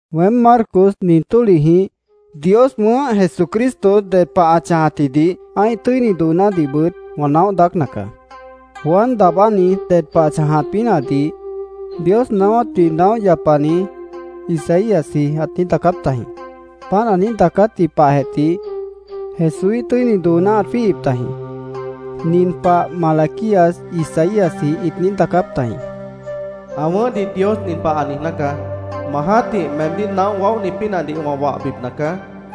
Weém, Marcos, nin tólihjĩh Dios wʉ̃ʉ́h Jesucristo, ded pah ã chãjatjidih, ã́ih tʉ́ini doonádihbʉt wã naóh daácna caá. Juan Daabáni ded pah ã chãjat pínahdih Dios naáwátdih naóh yapani Isaíasji ãt daacáp tajĩ. Páant ã niíj daacátji pahjeh tih Jesúíh tʉ́ini dooná ãt jwíihip tajĩ. Nin pah Malaquías, Isaíasjĩh ĩt niíj daacáp tajĩ: “Ã wʉ̃ʉ́hdih Dios nin pah ã niijná caá: ‘Ma jã́tih meemdíh naóh waóhni pínahdih wã wahbipna caá.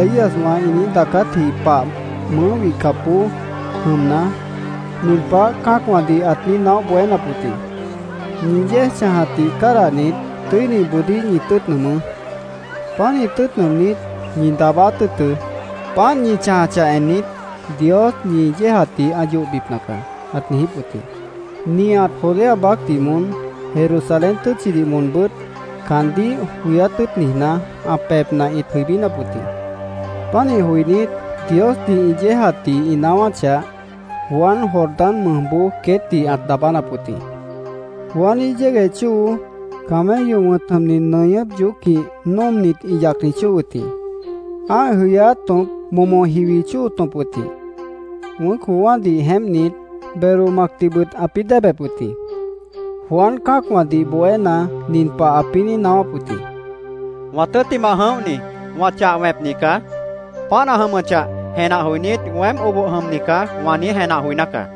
Juan Daabáni Isaíaswã ĩ niíj daacátji pah mʉʉ́ wihcapboó jʉmna, nin pah cã́acwãdih ãt niíj naóh bohénap wʉt jĩ: “Ñi yéej chãjatdih cádahnit, tʉ́iniboodíh ñi tʉ́ʉt nʉʉmʉ́. Pánih tʉ́ʉt nʉʉmnít, ñi daabáát tʉ́ʉtʉ́. Páant ñi chãjachah ennit, Dios ñi yéejatdih ã yohbipna caá”, ãt niijíp wʉt jĩ. Nihat Judea baácdih moón, Jerusalén tʉ́tchidih moonbʉ́t caandíh joyát tʉ́ʉt niijná, ã pebhna ĩt jʉibínap wʉt jĩ. Pánih joinít, Diosdih ĩ yéejatdih ĩ naáwáchah, Juan Jordán mʉjboó queétdih ãt daabánap wʉt jĩ. Juaníh yégueh chóo camello wʉ̃t jʉmni nʉñʉ́p yoócjĩh nóomnit, ĩ yacni chóo wʉt jĩ. Ã́ih jʉyáát tõp momo jiwi chóo tõp wʉt jĩ. Wʉ̃ʉ́c joowã́dih jeémpnit, belo macdihbʉt ãpĩ́ déebep wʉt jĩ. Juan cã́acwãdih bohéna, nin pah ãpĩ́ niíj naáwáp wʉt jĩ: “Wã tʉ́ttimah jʉ̃óhni wã chah wẽpni caá. Páant ã jʉmʉchah jenah joinít, ‘Weém oboh jʉmni caá’, wã niíj jenah joiná caá.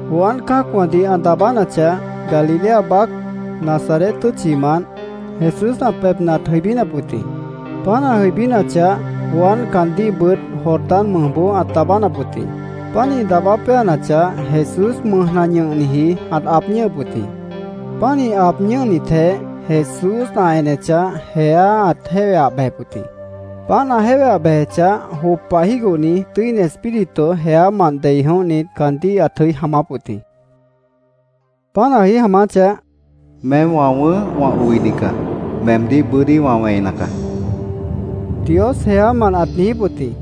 Juan cã́acwãdih ã daabánachah, Galilea baác, Nazaret tʉ́tchimant Jesús ã pebhna ãt jʉibínap wʉt jĩ. Páant ã jʉibínachah, Juan caandíhbʉt Jordán mʉjboó ãt daabánap wʉt jĩ. Pánih daabá péanachah, Jesús mʉjna ñʉhniji ãt aab ñʉ́hʉp wʉt jĩ. Pánih aab ñʉ́hnitjeh, Jesús ã enechah, jeá ãt jéweah bejep wʉt jĩ. Páant ã jéweah bejechah, jop pah jígohni Tʉ́ini Espíritu jeámant dei jʉ̃óhnit, caandíh ãt jʉí jaamáp wʉt jĩ. Páant ã jʉí jaamáchah, “Meém wã wʉ̃ʉ́h, wã oini caá. Meemdíh bʉ́dí wã wẽina caá”, Dios jeámant ãt niijíp wʉt jĩ.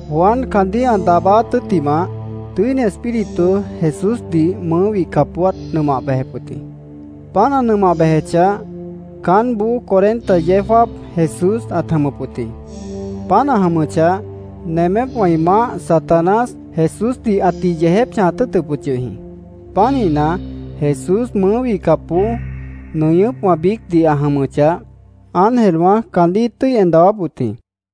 Juan caandíh ã daabáát tʉ́ttimah, Tʉ́ini Espíritu Jesúsdih mʉʉ́ wihcapboó ãt nʉmah bejep wʉt jĩ. Páant ã nʉmah bejechah, caánboó cuarenta yeó jáap Jesús ãt jʉmʉp wʉt jĩ. Páant ã jʉmʉchah, nemépwã ĩ maáh, Satanás, Jesúsdih ãtih yeejép chãjat tʉ́ʉtʉp wʉt yʉh jĩ. Pánihna, Jesús mʉʉ́ wihcapboó nʉñʉ́pwã biícdih ã jʉmʉchah, ángelwã caandíh ĩt tʉ́i en dawáp wʉt jĩ.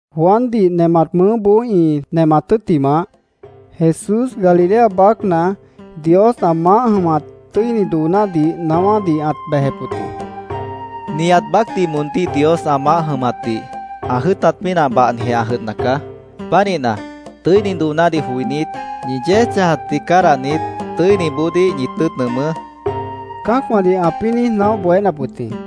Juandih nemat mʉʉ́boó ĩ nemat tʉ́ttimah, Jesús Galilea baácna Dios ã maáh jʉmat tʉ́ini doonádih naáwádih ãt bejep wʉt jĩ: “Nihat baácdih moondíh Dios ã maáh jʉmatdih ã jʉ́ʉtat pínah bahnijeh ã jʉdhna caá. Pánihna, tʉ́ini doonádih joinít, ñi yéej chãjatdih cádahnit, tʉ́iniboodíh ñi tʉ́ʉt nʉʉmʉ́”, cã́acwãdih ãpĩ́ niíj naóh bohénap wʉt jĩ.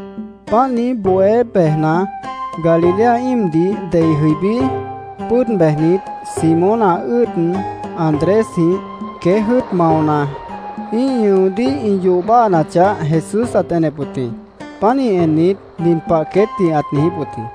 Páant niíj bohé bejna, Galilea íimdih dei jʉibí, pʉ́ʉd bejnit, Simón, ã ʉ́ʉd Andrésjĩh queéj jʉ́ʉt maona, ĩ́ih ñʉodíh ĩ yoh báhanachah, Jesús ãt enep wʉt jĩ. Pánih ennit, nin pah queétdih ãt niijíp wʉt jĩ: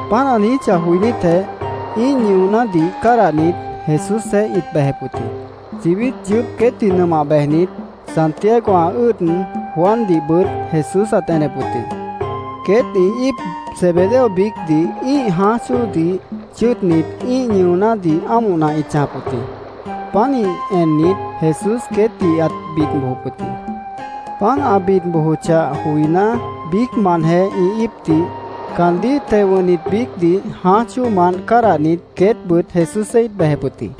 Páant ã niijíchah joinítjeh, ĩ́ih ñʉonádih cádahnit, Jesúsjeéh ĩt bejep wʉt jĩ. Chibít yʉʉ́p queétdih nʉmah bejnit, Santiago, ã ʉ́ʉd Juandihbʉt Jesús ãt enep wʉt jĩ. Queét ĩ íip Zebedeo biícdih ĩ́ih jãáj chóodih chʉ́ʉdnit, ĩ́ih ñʉonádih ámohna ĩt chãjap wʉt jĩ. Pánih ennit, Jesús queétdih ãt bid bojop wʉt jĩ. Páant ã bid bojochah joiná, biícmantjeh ĩ íipdih, caandíh teo wʉ̃hnit biícdih jãáj chóomant cádahnit, queétbʉt Jesúsjeéh ĩt bejep wʉt jĩ.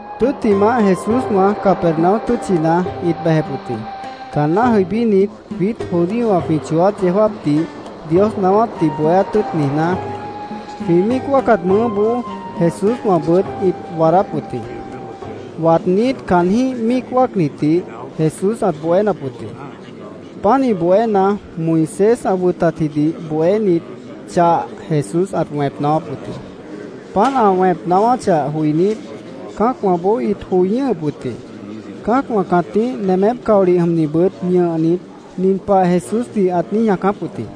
Tʉ́ttimah, Jesúswã Capernaum tʉ́tchina ĩt bejep wʉt jĩ. Caanná jʉibínit, jwiít judíowã jwĩ chooát yeó jáapdih Dios naáwátdih bohéát tʉ́ʉt niijná, jwĩ míic wáacat mʉʉ́boó Jesúswãbʉt ĩt waadáp wʉt jĩ. Waadnít, caanjĩ́h míic wáacnitdih Jesús ãt bohénap wʉt jĩ. Pánih bohéna, Moisés ã wʉtatjidih bohénit chah Jesús ãt wẽp naáwáp wʉt jĩ. Páant ã wẽp naáwáchah joinít, cã́acwãboó ĩt joi ñʉ́hʉp wʉt jĩ. Cã́acwã cãtíh nemép caolih jʉmnibʉt ñʉhnit, nin pah Jesúsdih ãt niíj ñaacáp wʉt jĩ.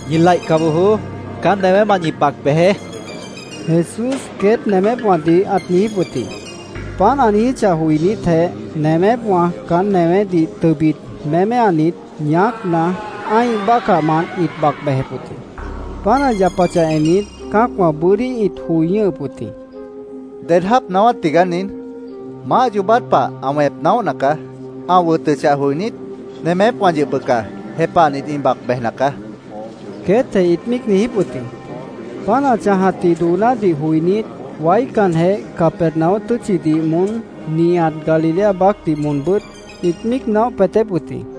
—¡Ñi laihca bojoó! ¡Caán newémant ñi bac bejeé! Jesús queét nemépwãdih ãt niijíp wʉt jĩ. Páant ã niijíchah joinítjeh, nemépwã caán newédih tʉbit méméanit, ñaácna, ã́ih bácahmant ĩt bac bejep wʉt jĩ. Páant ã yapachah ennit, cã́acwã bʉ́dí ĩt joi ñʉ́hʉp wʉt jĩ. —¿Ded jáap naáwát tigaá nin? ¡Maáh yoobát pah ã wẽp naóhna caá! ¡Ã wʉtʉchah joinít, nemépwã yʉh bʉca jepahnit, ĩ bac bejna caá! queétjeh ĩt míic niijíp wʉt jĩ. Páant ã chãjatji doonádih joinít, waícanjeh Capernaum tʉ́tchidih moón, nihat Galilea baácdih moonbʉ́t ĩt míic naóh peetép wʉt jĩ.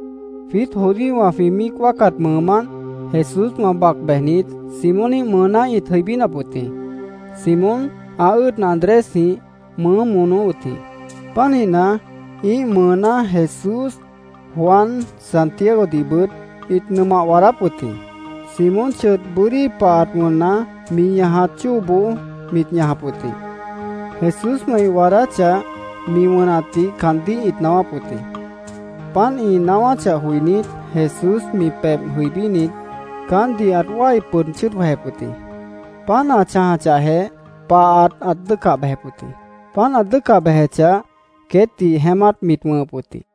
Jwiít judíowã jwĩ míic wáacat mʉʉmánt Jesúswã bac bejnit, Simóníh mʉʉná ĩt jʉibínap wʉt jĩ. Simón, ã ʉ́ʉd Andrésjĩh mʉʉ́ monó wʉt jĩ. Pánihna, ĩ́ih mʉʉná Jesús, Juan, Santiagodihbʉt, ĩt nʉmah waadáp wʉt jĩ. Simón chʉdh bʉ́dí pahat wʉnna, mi ñajat chóoboó mit ñajap wʉt jĩ. Jesúswã ĩ waadáchah, mi wʉnatdih caandíh ĩt naáwáp wʉt jĩ. Páant ĩ naáwáchah joinít, Jesús mi pebh jʉibínit, caántdih ãt wái pʉd chʉ́ʉd jwejep wʉt jĩ. Páant ã chãjachahjeh, pahat ãt dʉ́ʉcah bejep wʉt jĩ. Páant ã dʉ́ʉcah bejechah, queétdih jeémát mit wʉ̃hʉp wʉt jĩ.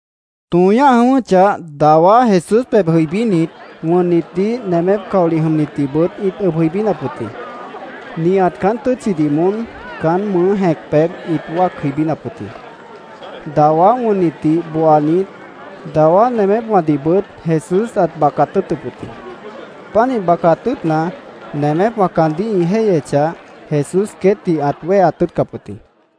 Tõo ñáh jʉ̃ʉ́wʉ́chah, dawá Jesús pebh jʉibínit, wʉnnitdih, nemép caolih jʉmnitdihbʉt ĩt ʉb jʉibínap wʉt jĩ. Nihat caán tʉ́tchidih moón caán mʉʉ́ jẽc pebh ĩt wáac jʉibínap wʉt jĩ. Dawá wʉnnitdih booanit, dawá nemépwãdihbʉt Jesús ãt bacat tʉ́ʉtʉp wʉt jĩ. Pánih bacat tʉ́ʉtna, nemépwã caandíh ĩ jéihyechah, Jesús queétdih ãt wéheat tʉ́ʉtcap wʉt jĩ.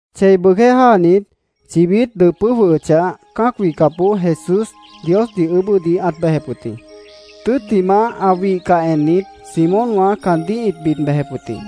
Chei bʉʉgjéh jáanit, chibít dʉpʉ́ jwʉhʉchah, cã́ac wihcapboó Jesús Diosdih ʉʉ́bʉ́dih ãt bejep wʉt jĩ. Tʉ́ttimah, ã wihcah ennit, Simónwã caandíh ĩt bid bejep wʉt jĩ.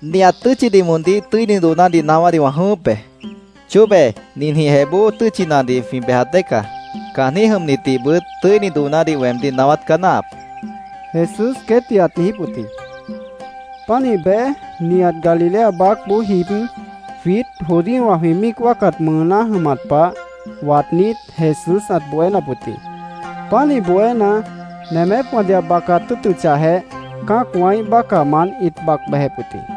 —Nihat tʉ́tchidih moondíh tʉ́ini doonádih naáwádih wã jʉ̃ʉ́wʉ́p be. Chóbe ninjĩhjeh bóo tʉ́tchinadih jwĩ bejat dée caá. Caanjĩ́h jʉmnitdihbʉt tʉ́ini doonádih weemdíh naáwát caá náahap, Jesús queétdih ãt niijíp wʉt jĩ. Pánih bej, nihat Galilea baácboó jib, jwiít judíowã jwĩ míic wáacat mʉʉná jʉmat pah waadnít, Jesús ãt bohénap wʉt jĩ. Pánih bohéna, nemépwãdih ã bacat tʉ́ʉtʉchahjeh, cã́acwãíh bácahmant ĩt bac bejep wʉt jĩ.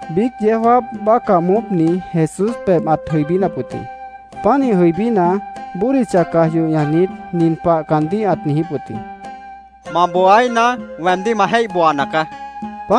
Biíc yeó jáap bácah moópni Jesús pebh ãt jʉibínap wʉt jĩ. Pánih jʉibína, bódicha caj yoh ñajnit, nin pah caandíh ãt niijíp wʉt jĩ: —Ma booaíhna, weemdíh ma jéih booana caá, ãt niijíp wʉt jĩ.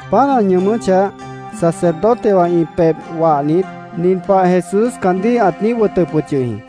Páant ã ñʉʉmʉ́chah, sacerdotewã ĩ pebh wahnit, nin pah Jesús caandíh ãt niíj wʉtʉp wʉt yʉh jĩ: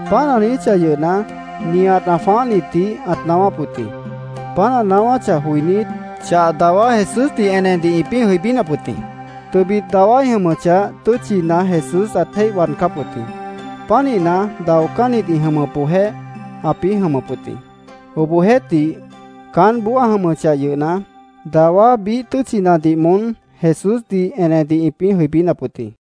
Páant ã niijíchah yʉhna, nihat ã jwãáhnitdih ãt naáwáp wʉt jĩ. Páant ã naáwáchah joinít, chah dawá Jesúsdih enedih ĩpĩ́ jʉibínap wʉt jĩ. Tʉbit dawá ĩ jʉmʉchah, tʉ́tchina Jesús ãt jéih waadcáp wʉt jĩ. Pánihna, daocánnit ĩ jʉmʉpboojéh ãpĩ́ jʉmʉp wʉt jĩ. Obohjeéhtih, caánboó ã jʉmʉchah yʉhna, dawá biíh tʉ́tchinadih moón Jesúsdih enedih ĩpĩ́ jʉibínap wʉt jĩ.